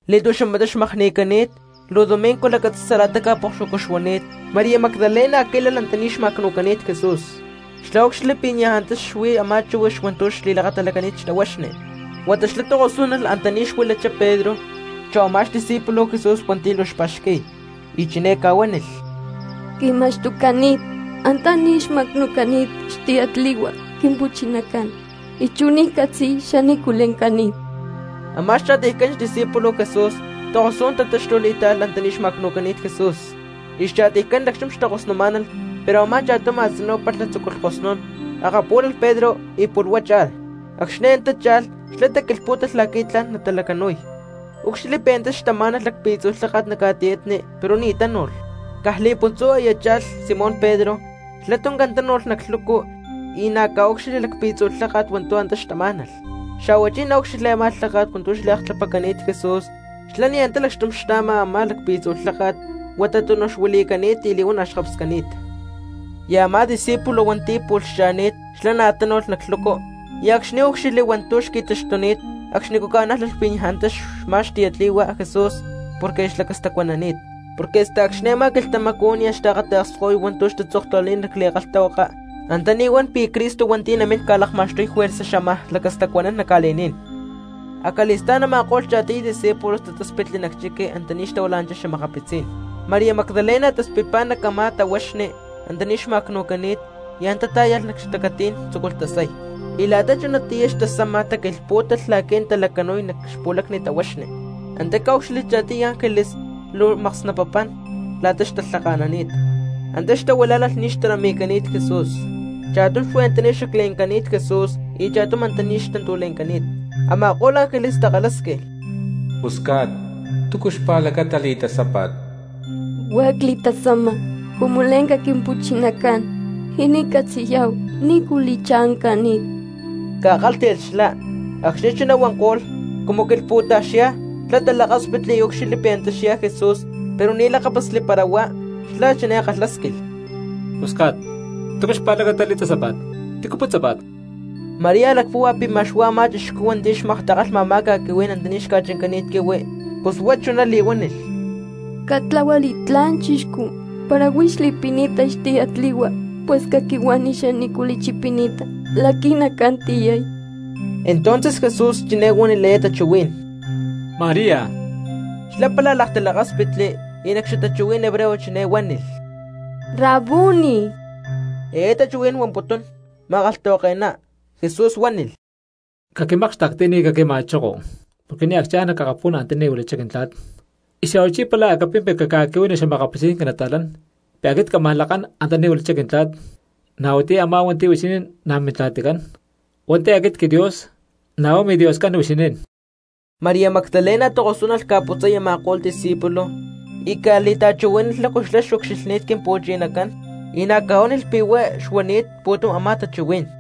Li̠tu̠xamatá xmakni̠cani̠t, luu domingo lacatzi̠sa la̠ta ca̠pokxuacú xuani̠t, María Magdalena quí̠lalh antaní xma̠cnu̠cani̠t Jesús. Xlá úcxilhli pi̠ niaj antá xuí a̠má chíhuix hua̠ntu̠ xli̠lakatalacani̠t xtahuaxni. Huata xlá tokosú̠n alh antaní xtahuila̠nanchá Pedro chú a̠má xdiscípulo Jesús hua̠nti̠ luu xpa̠xqui̠y, y chiné ca̠huánilh: —Qui̠ma̠xtucani̠t antaní xma̠cnu̠cani̠t xtiyatli̠hua Quimpu̠chinacán, y chú ni̠ xcatzi xanícu le̠ncani̠t. Amá xcha̠tiycán xdiscípulos Jesús takosú̠n tatáxtulh y táalh antaní xma̠cnu̠cani̠t Jesús. Xcha̠tiycán lacxtum xtakosnumá̠nalh pero a̠má cha̠tum a̠tzinú palha tzúculh kosnún akapú̠lalh Pedro y pu̠lh huá cha̠lh. Acxni̠ antá cha̠lh xlá taquilhpú̠talh la̠qui̠ tla̠n natalacanu̠y, úcxilhli pi̠ antá xtamá̠nalh lacpi̠tzu̠ lháka̠t nac ca̠tiyatni pero ni̠ tánu̠lh. Caj li̠puntzú aya cha̠lh Simón Pedro, xlá tuncán tánu̠lh nac lhucu y na̠ ca̠úcxilhli lacpi̠tzu̠ lháka̠t hua̠ntu̠ antá xtamá̠nalh. Xa̠huachí ná úcxilhli a̠má lháka̠t hua̠ntu̠ xliaktlapacani̠t Jesús xlá ni̠ antá lacxtum xtá̠ma a̠má lacpi̠tzu̠ lháka̠t, huata túnuj xuili̠cani̠t y li̠huana̠ xkapscani̠t. Amá discípulo hua̠nti̠ pu̠lh xcha̠ni̠t xlá na̠ tánu̠lh nac lhucu y acxni̠ úcxilhli hua̠ntu̠ xqui̠taxtuni̠t acxnicú ca̠nájlalh pi̠ niaj antá xmá xtiyatli̠hua Jesús porque xlacastacuanani̠t. Porque hasta acxni̠ a̠má quilhtamacú nia̠ xtaakata̠ksko̠y hua̠ntu̠ xtatzoktahuilani̠t nac li̠kalhtahuaka antaní huan pi̠ Cristo hua̠nti̠ namín ca̠lakma̠xtuy juerza xámaj lacastacuanán nac ca̠li̠ní̠n. Acali̠stá̠n a̠ma̠ko̠lh cha̠tiy discípulos tatáspitli nac chiqui antaní xtahuilá̠nalh xa̠makapitzí̠n. María Magdalena taspitpá nac a̠má tahuaxni antaní xma̠cnu̠cani̠t y antá tá̠yalh nac xtanquilhtí̠n tzúculh tasay. Y la̠ta chunatiyá xtasama taquilhpú̠talh la̠qui̠ natalacanu̠y nac xpu̠lacni tahuaxni. Antá ca̠úcxilhli cha̠tiy ángeles, luu maksnapapán la̠ta xtalhaka̠nani̠t, antá xtahuilá̠nalh ní xtarami̠cani̠t Jesús, cha̠tum xuí antaní xacle̠ncani̠t Jesús y cha̠tum antaní xtantúle̠ncani̠t. Ama̠ko̠lh ángeles takalhásquilh: —Pusca̠t, ¿túcu xpa̠lacata li̠tasápa̠t? —Huá cli̠tasama cumu le̠nca Quimpu̠chinacán y ni̠ ccatzi̠yá̠hu nícu li̠cha̠ncani̠ —ca̠kálhti̠lh xlá. Acxni̠ chuná huanko̠lht, cumu quilhpu̠taj xyá xlá talakáspitli y úcxilhli pi̠ antá xyá Jesús pero ni̠ lakápasli para huá. Xlá chiné kalhásquilh: —Pusca̠t, ¿túcu xpa̠lacata li̠tasápa̠t? ¿Tícu putzápa̠t? María lacpúhua pi̠ ma̠x huá a̠má chixcú hua̠nti̠ xmaktakalha a̠má ca̠quihuí̠n antaní xca̠chancani̠t quihui, pus huá chiné li̠huánilh: —Catlahua li̠tlá̠n chixcú, para huix li̠pini̠ta xtiyatli̠hua, pus caquihuani xanícu li̠chipini̠ta la̠qui̠ nacán tiyay. Entonces Jesús chiné huánilh eé tachuhuí̠n: —¡María! Xlá pála laktalakáspitli, y nac xatachuhuí̠n hebreo chiné huánilh: —¡Rabuni! —eé tachuhuí̠n huamputún Ma̠kalhtahuake̠ná. Jesús huánilh: —Caquimákxtekti y ni̠ caquima̠choko, porque nia̠ ccha̠n nac akapú̠n antaní huilachá Quintla̠t. Y xa̠huachí pála capimpi caca̠qui̠huani xa̠makapitzí̠n quinata̠lán pi̠ aquit cámaj lakán antaní huilachá Quintla̠t, na̠ huatiyá a̠má hua̠ntu̠ huixinín na̠ Mintla̠ticán; hua̠nti̠ aquit quiDios, na̠ huá miDioscán huixinín. María Magdalena tokosú̠n alh ca̠putzay a̠ma̠ko̠lh discípulos y ca̠li̠ta̠chuhuí̠nalh lácu xlá xucxilhni̠t Quimpu̠chinacán y na̠ ca̠huánilh pi̠ huá xuanini̠t pu̠tum a̠má tachuhuí̠n.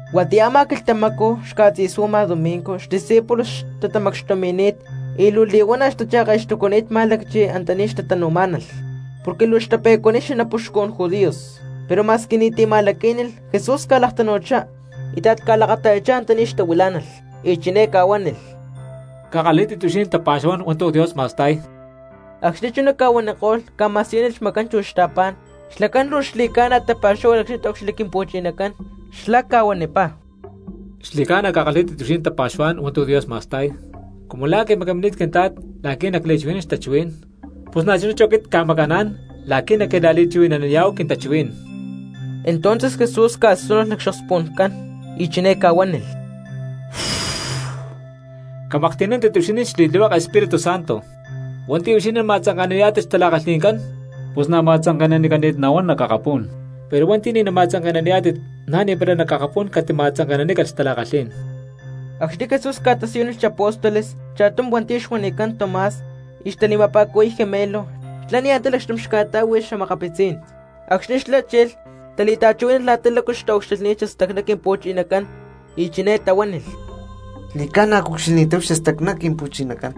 Huatiyá a̠má quilhtamacú xca̠tzi̠suama domingo xdiscípulos xtatamacxtumi̠ni̠t y luu li̠huana̠ xtacha̠ke̠xtucuni̠t má̠lacchi antaní xtatanu̠má̠nalh porque luu xtape̠cuaniy xanapuxcun judíos. Pero ma̠squi ni̠ti̠ ca̠ma̠laquínilh Jesús ca̠laktanu̠chá, íta̠t ca̠lakata̠yachá antaní xtahuilá̠nalh y chiné ca̠huánilh: —Cakalhí̠tit huixinín tapa̠xuhuá̠n hua̠ntu̠ Dios ma̠sta̠y. Acxni̠ chuná ca̠huaniko̠lh ca̠ma̠siyúnilh xmacán chu xta̠pá̠n. Xlacán luu xli̠ca̠na tapa̠xúhualh acxni̠ taúcxilhli Quimpu̠chinacán. Xlá ca̠huanipá: —Xli̠ca̠na cakalhí̠tit huixinín tapa̠xuhuá̠n hua̠ntu̠ Dios ma̠sta̠y. Cumu la̠ quimacamini̠t Quintla̠t la̠qui̠ nacli̠chuhui̠nán xtachuhuí̠n, pus na̠chuná chú aquit cca̠maca̠ná̠n la̠qui̠ naquila̠li̠chuhui̠naniyá̠hu quintachuhuí̠n. Entonces Jesús ca̠súnulh nac xokspu̠ncán y chiné ca̠huánilh: —Camaklhti̠nántit huixinín xli̠tlihueke Espírutu Santo. Hua̠nti̠ huixinín nama̠tzanke̠naniyá̠tit xtala̠kalhi̠ncán pus na̠ ma̠tzanke̠nanicani̠t nahuán nac akapú̠n; pero hua̠nti̠ ni̠ nama̠tzanke̠naniyá̠tit na̠ ni̠para nac akapú̠n catima̠tzanke̠nanícalh xtala̠kalhí̠n. Acxni̠ Jesús ca̠tasiyúnilh xapóstoles cha̠tum hua̠nti̠ xuanicán Tomás y xtali̠ma̠pa̠cuhui̠y Gemelo, xlá ni̠ antá lacxtum xca̠tá̠hui xa̠makapitzí̠n. Acxni̠ xlá chilh, tali̠ta̠chuhuí̠nalh la̠ta lácu xtaucxilhni̠t xastacná Quimpu̠chinacán, y chiné tahuánilh: —Xli̠ca̠na cucxilhni̠táhu xastacná Quimpu̠chinacán.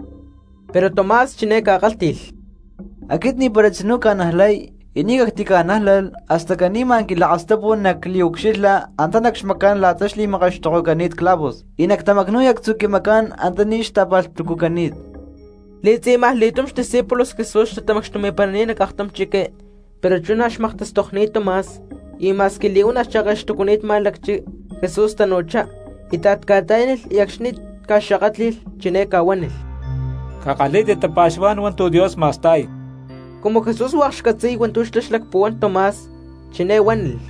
Pero Tomás chiné ca̠kálhti̠lh: —Aquit ni̠para tzinú cca̠najlay, y ni̠ cactica̠nájlalh hasta caní ma̠n quilakastapu nacliucxilha antá nac xmacán la̠ta xli̠makaxtokocani̠t clavos, y nactamacnu̠y actzu̠ quimacán antaní ta̠pa̠lhtucucani̠t. Li̠tzi̠majli̠túm xdiscípulos Jesús xtatamacxtumi̠parani̠t nac aktum chiqui, pero chú na̠ xmaktastokni̠t Tomás. Y ma̠squi li̠huana̠ xcha̠ke̠xtucucani̠t má̠lacchi Jesús tanu̠chá, íta̠t ca̠ta̠yánilh y acxni̠ ca̠xakátli̠lh chiné ca̠huánilh: —Cakalhí̠tit tapa̠xuhuá̠n hua̠ntu̠ Dios ma̠sta̠y. Cumu Jesús hua̠k xcatzi̠y hua̠ntu̠ xlá xlacpuhuán Tomás, chiné huánilh: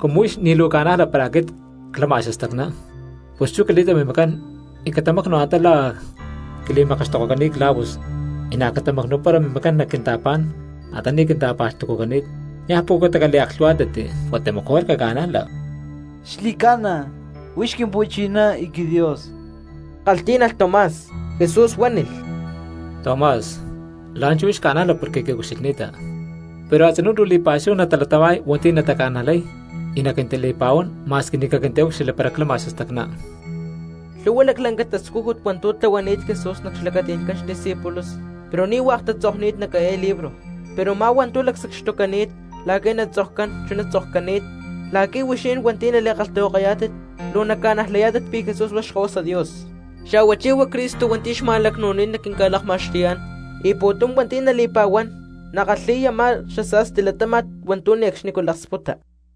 —Cumu huix ni̠ luu ca̠najla para aquit clama xastacná, pus chú cali̠ta mimacán y catamacnu antá la̠ a̠ quili̠makaxtokocani̠t clavos y na̠ catamacnu̠para mimacán nac quinta̠pá̠n antaní quinta̠pa̠lhtucucani̠t; niaj pucutá caliaklhu̠huá̠tnanti huata mejor caca̠najla. —¡Xli̠ca̠na, huix Quimpu̠chiná y quiDios! —kalhtí̠nalh Tomás. Jesús huánilh: —Tomás, la̠nchú huix ca̠najla porque quiucxilhni̠ta, pero a̠tzinú luu li̠pa̠xúhu natalatama̠y hua̠nti̠ nataca̠najlay y naquintali̠pa̠huán ma̠squi ni̠ caquintaúcxilhli para clama xastacná. Lhu̠hua laclanca tascújut hua̠ntu̠ tlahuani̠t Jesús nac xlacati̠ncán xdiscípulos, pero ni̠ hua̠k tatzokni̠t nac eé libro. Pero u̠má hua̠ntu̠ lacsacxtucani̠t la̠qui̠ natzokcán chuná tzokcani̠t la̠qui̠ huixinín hua̠nti̠ nali̠kalhtahuakayá̠tit luu naca̠najlayá̠tit pi̠ Jesús huá Xkahuasa Dios, xa̠huachí huá Cristo hua̠nti̠ xma̠lacnu̠cani̠t la̠qui̠ naquinca̠lakma̠xtuyá̠n, y pu̠tum hua̠nti̠ natali̠pa̠huán natakalhi̠y a̠má xasa̠sti latáma̠t hua̠ntu̠ ne̠cxni laksputa.